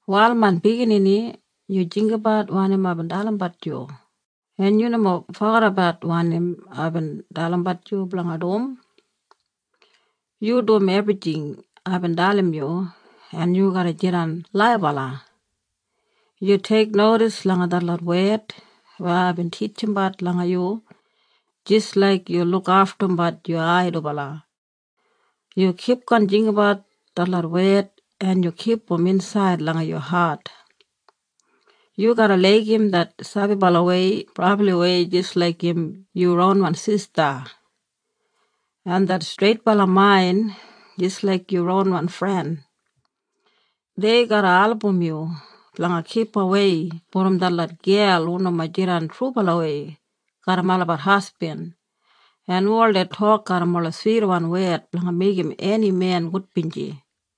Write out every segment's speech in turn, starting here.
“Wal main biginini, yu jinggabat wanim aibin dalimbat yu, en yu nomo fogedabat wanim aibin dalimbat yu blanga dum. Yu dum ebrijing aibin dalim yu en yu garra jidan laibala. Yu teiknodis langa detlot wed weya aibin titjimbat langa yu jis laik yu lukaftumbat yu ai dubala. Yu kipgon jinggabat detlot wed en yu kipum insaid langa yu hat. Yu garra laigim det sabibalawei brabliwei jis laik im yu ronwan sista, en det streitbala main jis laik yu ronwan fren. Dei garra album yu blanga kipawei brom detlot gel hu nomo jidan trubalawei garram olabat hasbin en hu oldei tok garram ola switwan wed blanga meigim eni men gudbinji.”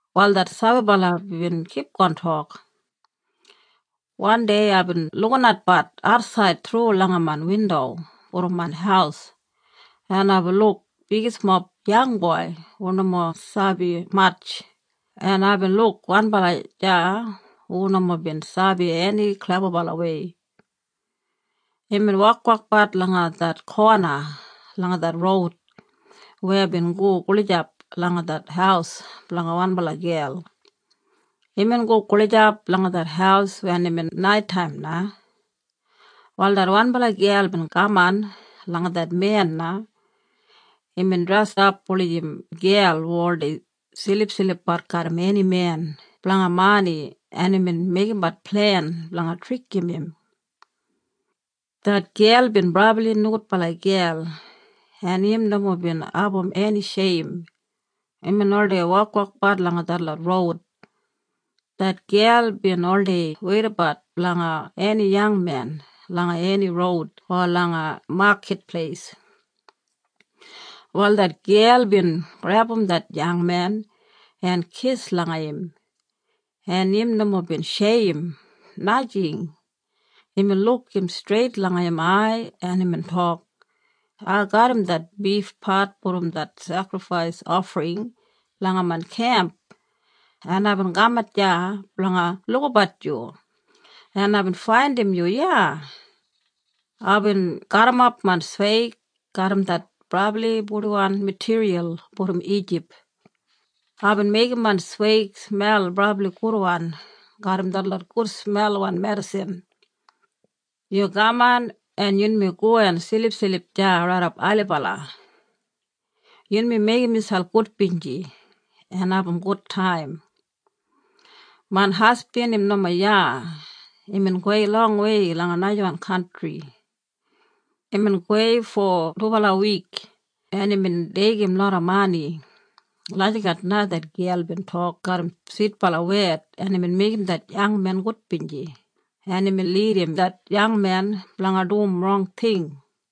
Wal det sabibala bin kipgon tok, “Wandei aibin lukinatbat atsaid thru langa main windo brom main haus, en aibin luk bigismob yangboi hu nomo sabi matj, en aibin luk wanbala deya hu nomo bin sabi eni klebabalawei. Imbin wokwokbat langa det kona langa det roud weya bin go gulijap langa det haus blanga wanbala gel. Imbin go gulijap langa det haus wen imbin naitaim na. “Wal det wanbala gel bin kaman langa det men na. Imbin dresap wulijim gel hu oldei silipsilipbat garram eni men blanga mani en imbin meigimbat plen blanga trikim im. Det gel bin brabli nogudbala gel en im nomo bin abum eni sheim. Imbin oldei wokwokbat langa detlot roud. Det gel bin oldei weidabat blanga eni yangmen langa eni roud o langa makit pleis. “Wal det gel bin grebum det yangmen en kis langa im, en im nomo bin sheim, najing. Imbin luk im streit langa im ai en imbin tok, ‘Ai garram det bifpat brom det sekrifais ofring langa main kemp, en aibin kamat iya blanga lukabat yu, en aibin faindim yu iya. Aibin gaburrumap main sweig garram det brabli purdiwan matiriyal brom Ijip. Aibin meigim main sweig smel brabli gudwan garram detlot gudsmelwan medisin. Yu kaman en yunmi go en silipsilip deya raidap ailibala. Yunmi meigim miselp gudbinji en abum gudtaim. Main hasbin im nomo iya. Imbin gowei longwei langa najawan kantri. Imbin gowei fo dubala wik, en imbin deigim loda mani.’ Lagijat na det gel bin tok garram switbala wed en imbin meigim det yangmen gudbinji, en imbin lidim det yangmen blanga dum rong ting.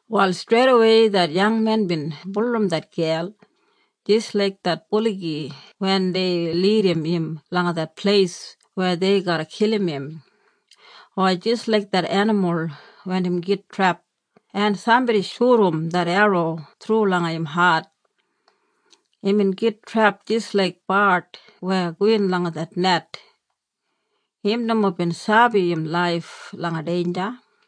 “Wal streidawei det yangmen bin bulurrum det gel jis laik det buligi wen dei lidim im langa det pleis weya dei garra kilim im, o jis laik det enimul wen im git trep, en sambodi shudum det erro thru langa im hat. Imbin git trep jis laik bard weya gowin langa det net. Im nomo bin sabi im laif langa deinja.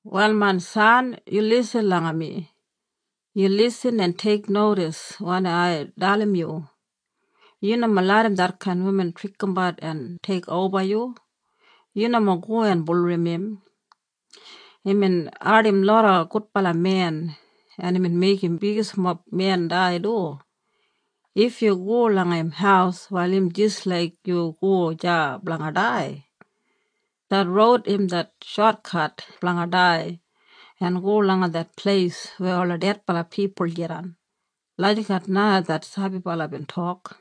“Wal main san, yu lisin langa mi. Yu lisin en teiknodis wanim ai dalim yu. Yu nomo larram detkain wuman trikimbat en teikoba yu. Yu nomo go en bulurrum im. Imbin ardim loda gudbala men en imbin meigim bigismob men dai du. If yu go langa im haus wal im jis laik yu go deya blanga dai. Det roud im det shotkat blanga dai en go langa det pleis weya ola dedbala pipul jidan.” Lagijat na det sabibala bin tok.